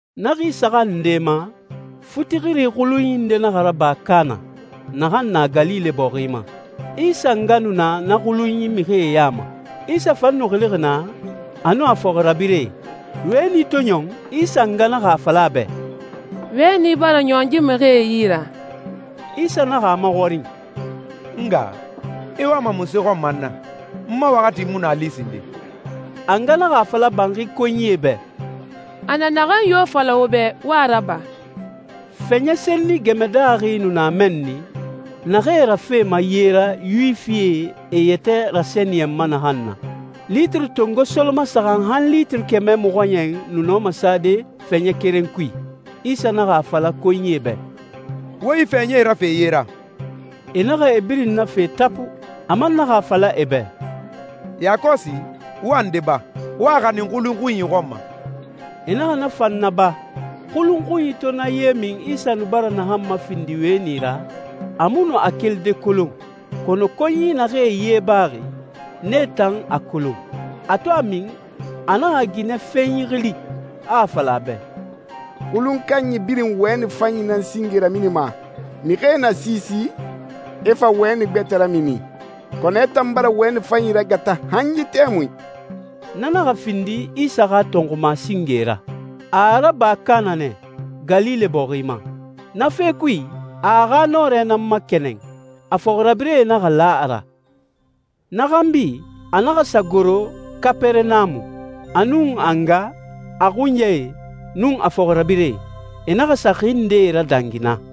Na xi saxan nde ma, futixiri xulunyi nde naxa raba Kaana, naxan na Galile bɔxi ma. Isa nga nu na na xulun mixie ya ma. Isa fan nu xilixi naa, a nun a fɔxirabirɛe. Wɛni to ɲɔn, Isa nga naxa a fala a bɛ, «Wɛni bara ɲɔn yi mixie yi ra.» Isa naxa a maxɔrin, «N nga, i wama munse xɔn ma n na? N ma waxati mu nu a li sinden.» A nga naxa a fala banxi konyie bɛ, «A na naxan yo fala wo bɛ, wo a raba.» Fɛɲɛ senni gɛmɛ daaxi nu na mɛnni, naxee rafema ye ra Yuwifie e yɛtɛ rasɛniyɛnma naxan na. Litiri tongo solomasaxan han litiri kɛmɛ mɔxɔɲɛn nu nɔma sade fɛɲɛ keren kui. Isa naxa a fala konyie bɛ, «Wo yi fɛɲɛe rafe ye ra.» E naxa e birin nafe tapu. A man naxa a fala e bɛ, «Yakɔsi, wo a nde ba, wo a xanin xulun xunyi xɔn ma.» E naxa na fan naba. Xulun xunyi to na ye min Isa nu bara naxan mafindi wɛni ra, a mu nu a kelide kolon, kɔnɔ konyi naxee ye baxi, nee tan a kolon. A to a min, a naxa ginɛfenyi xili, a a fala a bɛ, «Xulun kanyi birin wɛni fanyi nan singe raminima, mixie na siisi, e fa wɛni gbɛtɛ ramini. Kɔnɔ i tan bara wɛni fanyi ragata han yi tɛmui!» Na naxa findi Isa xa tɔnxuma singe ra. A a raba Kaana nɛ, Galile bɔxi ma. Na fe kui, a a xa nɔrɛ nan makɛnɛn, a fɔxirabirɛe naxa la a ra. Na xanbi, a naxa sa goro Kapɛrɛnamu, a nun a nga, a xunyae, nun a fɔxirabirɛe. E naxa sa xi ndee radangi naa.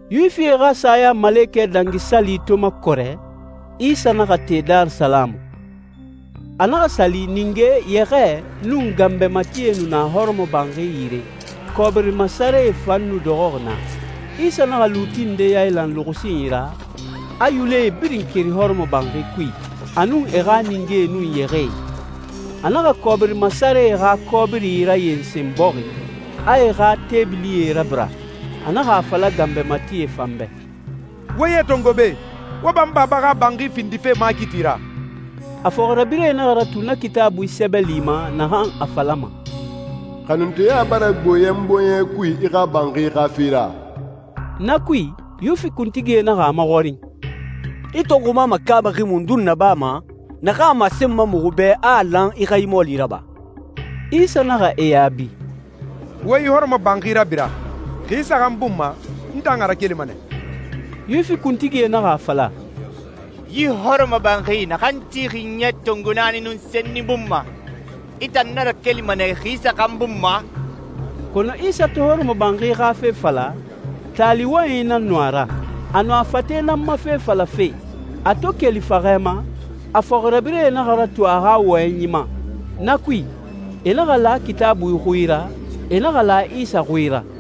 Yuwifie xa Sayamalekɛ Dangi Sali to makɔrɛ, Isa naxa te Darisalamu. A naxa sa li, ninge, yɛxɛɛ, nun ganbɛ matie nu na hɔrɔmɔbanxi yire, kɔbiri masarɛe fan nu dɔxɔxi naa. Isa naxa luuti ndee yailan luxusinyi ra, a yulɛe birin keri hɔrɔmɔbanxi kui, a nun e xa ningee nun yɛxɛɛe. A naxa kɔbiri masarɛe xa kɔbiri rayensen bɔxi, a e xa teebilie rabira. A naxa a fala ganbɛ matie fan bɛ, «Wo yee tongo be! Wo ba n Baba xa banxi findife makiti ra!» A fɔxirabirɛe naxa ratu na Kitaabui sɛbɛli ma naxan a falama, «Xanunteya bara gbo yɛ n bɔɲɛ kui i xa banxi xa fe ra.» Na kui, Yuwifi kuntigie naxa a maxɔrin, «I tɔnxuma makaabaxi mundun nabama naxan a masenma muxu bɛ a a lan i xa yi mɔɔli raba?» Isa naxa e yaabi, «Wo yi hɔrɔmɔbanxi rabira. Xi saxan bun ma n tan a rakelima.» Yuwifi kuntigie naxa a fala, «Yi hɔrɔmɔbanxi naxan tixi ɲɛ tongo naani nun senni bun ma, i tan na rakelima nɛ xi saxan bun ma?» Kɔnɔ Isa to hɔrɔmɔbanxi xa fe fala, taali wɔyɛnyi nan nu a ra. A nu a fate nan ma fe falafe. A to keli faxɛ ma, a fɔxirabirɛe naxa ratu a xa wɔyɛnyi ma. Na kui, e naxa la Kitaabui xui ra, e naxa la Isa xui ra.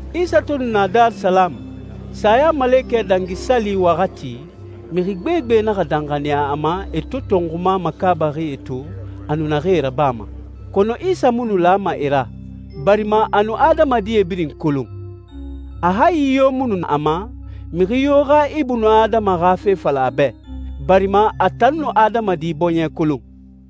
Isa to nu na Darisalamu, Sayamalekɛ Dangi Sali waxati, mixi gbegbe naxa danxaniya a ma e to tɔnxuma makaabaxie to, a nu naxee rabama. Kɔnɔ Isa mu nu lama e ra, barima a nu adamadi birin kolon. A hayi yo mu nu a ma, mixi yo xa ibunadama xa fe fala a bɛ, barima a tan nu adamadi bɔɲɛ kolon.